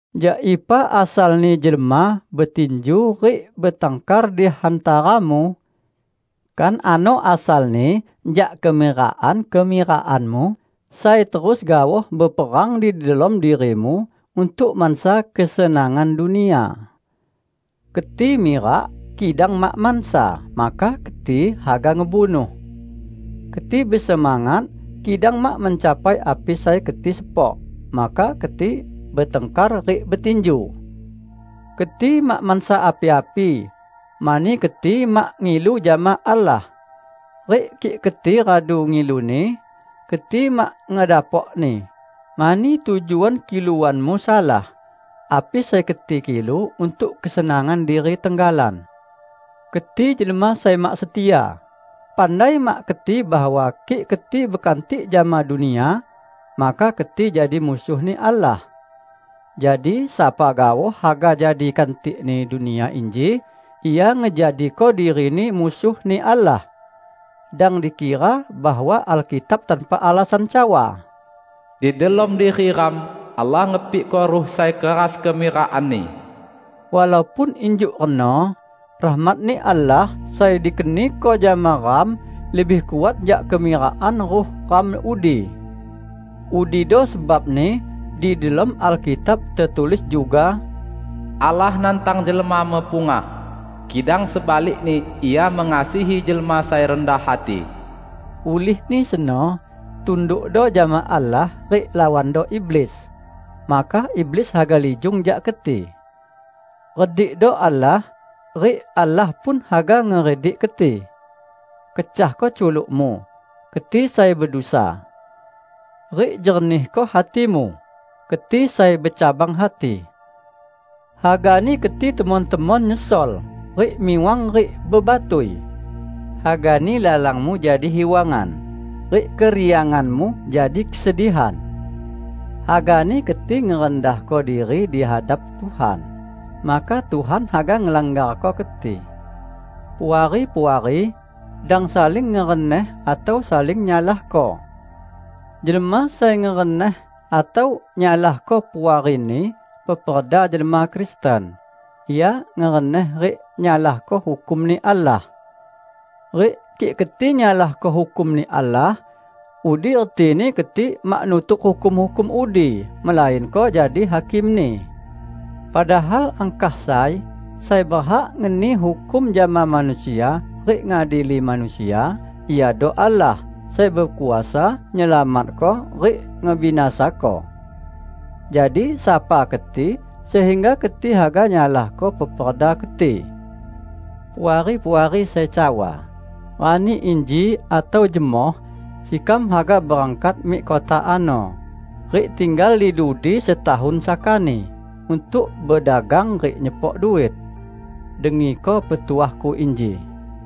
Jak ipa asalni jelma betinju rik betangkar di hantaramu? Kan ano asalni jak kemirakan-kemirakanmu sai terus gaoh beperang di delom dirimu untuk mansa kesenangan dunia! Keti mirak, kidang mak mansa, maka keti haga ngebunuh! Keti besemangat, kidang mak mencapai api sai keti sepok, maka keti betangkar rik betinju. Keti mak mansa api-api, mani keti mak ngilu jama Allah. Rik kik keti radu ngiluni, keti mak ngedapokni, mani tujuan kiluanmu salah; api sai keti kilu, untuk kesenangan diri tenggalan. Keti jelma sai mak setia! Pandai mak keti bahwa kik keti bekantik jama dunia, maka keti jadi musuh-Ni Allah. Jadi sapa gaoh haga jadi kantikni dunia inji, ia ngejadiko dirini musuh-Ni Allah. Dang dikira bahwa Alkitab tanpa alasan cawa, "Di delom diri ram Allah ngepikko Ruh sai keras kemirakanni." Walaupun injuk reno, rahmat-Ni Allah sai dikeniko jama ram lebih kuat jak kemirakan ruh ram udi. Udido sebabni di delom Alkitab tetulis juga, "Allah nantang jelma mepungah, kidang sebalikni Ia mengasihi jelma sai rendah hati." Ulihni seno, tundukdo jama Allah rik lawando iblis, maka iblis haga lijung jak keti. Redikdo Allah, rik Allah pun haga ngeredik keti. Kecahko culukmu, keti sai bedusa! Rik jernihko hatimu, keti sai becabang hati! Hagani keti temon-temon nyesol rik miwang rik bebatui; hagani lalangmu jadi hiwangan rik kerianganmu jadi kesedihan! Hagani keti ngerendahko diri di hadap Tuhan, maka Tuhan haga ngelanggarko keti. Puari-puari, dang saling ngereneh atau saling nyalahko. Jelma sai ngereneh atau nyalahko puarini peperda jelma Kristen, ia ngereneh rik nyalahko hukum-Ni Allah. Rik kik keti nyalahko hukum-Ni Allah, udi retini keti mak nutuk hukum-hukum udi, melainko jadi hakimni. Padahal angkah sai sai berhak ngeni hukum jama manusia rik ngadili manusia, Iado Allah sai bekuasa nyelamatko rik ngebinasako. Jadi, sapa keti, sehingga keti haga nyalahko peperda keti. Puari-puari sai cawa, "Rani inji atau jemoh sekam haga berangkat mik kota ano rik tinggal di dudi setahun sakani untuk bedagang rik nyepok duit," -- dengiko petuahku inji.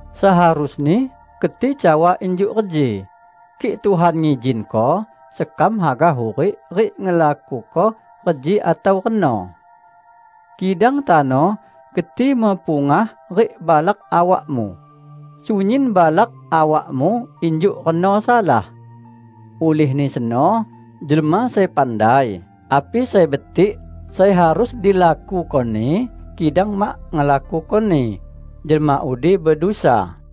Seharusni keti cawa injuk reji, "Kik Tuhan ngizinko, sekam haga hurik rik ngelakuko reji atau reno." Kidang tano keti mepungah rik balak awakmu. Sunyin balak awakmu injuk reno salah. Ulihni seno, jelma sai pandai api sai betik sai harus dilakukoni kidang mak ngelakukoni, jelma udi bedusa.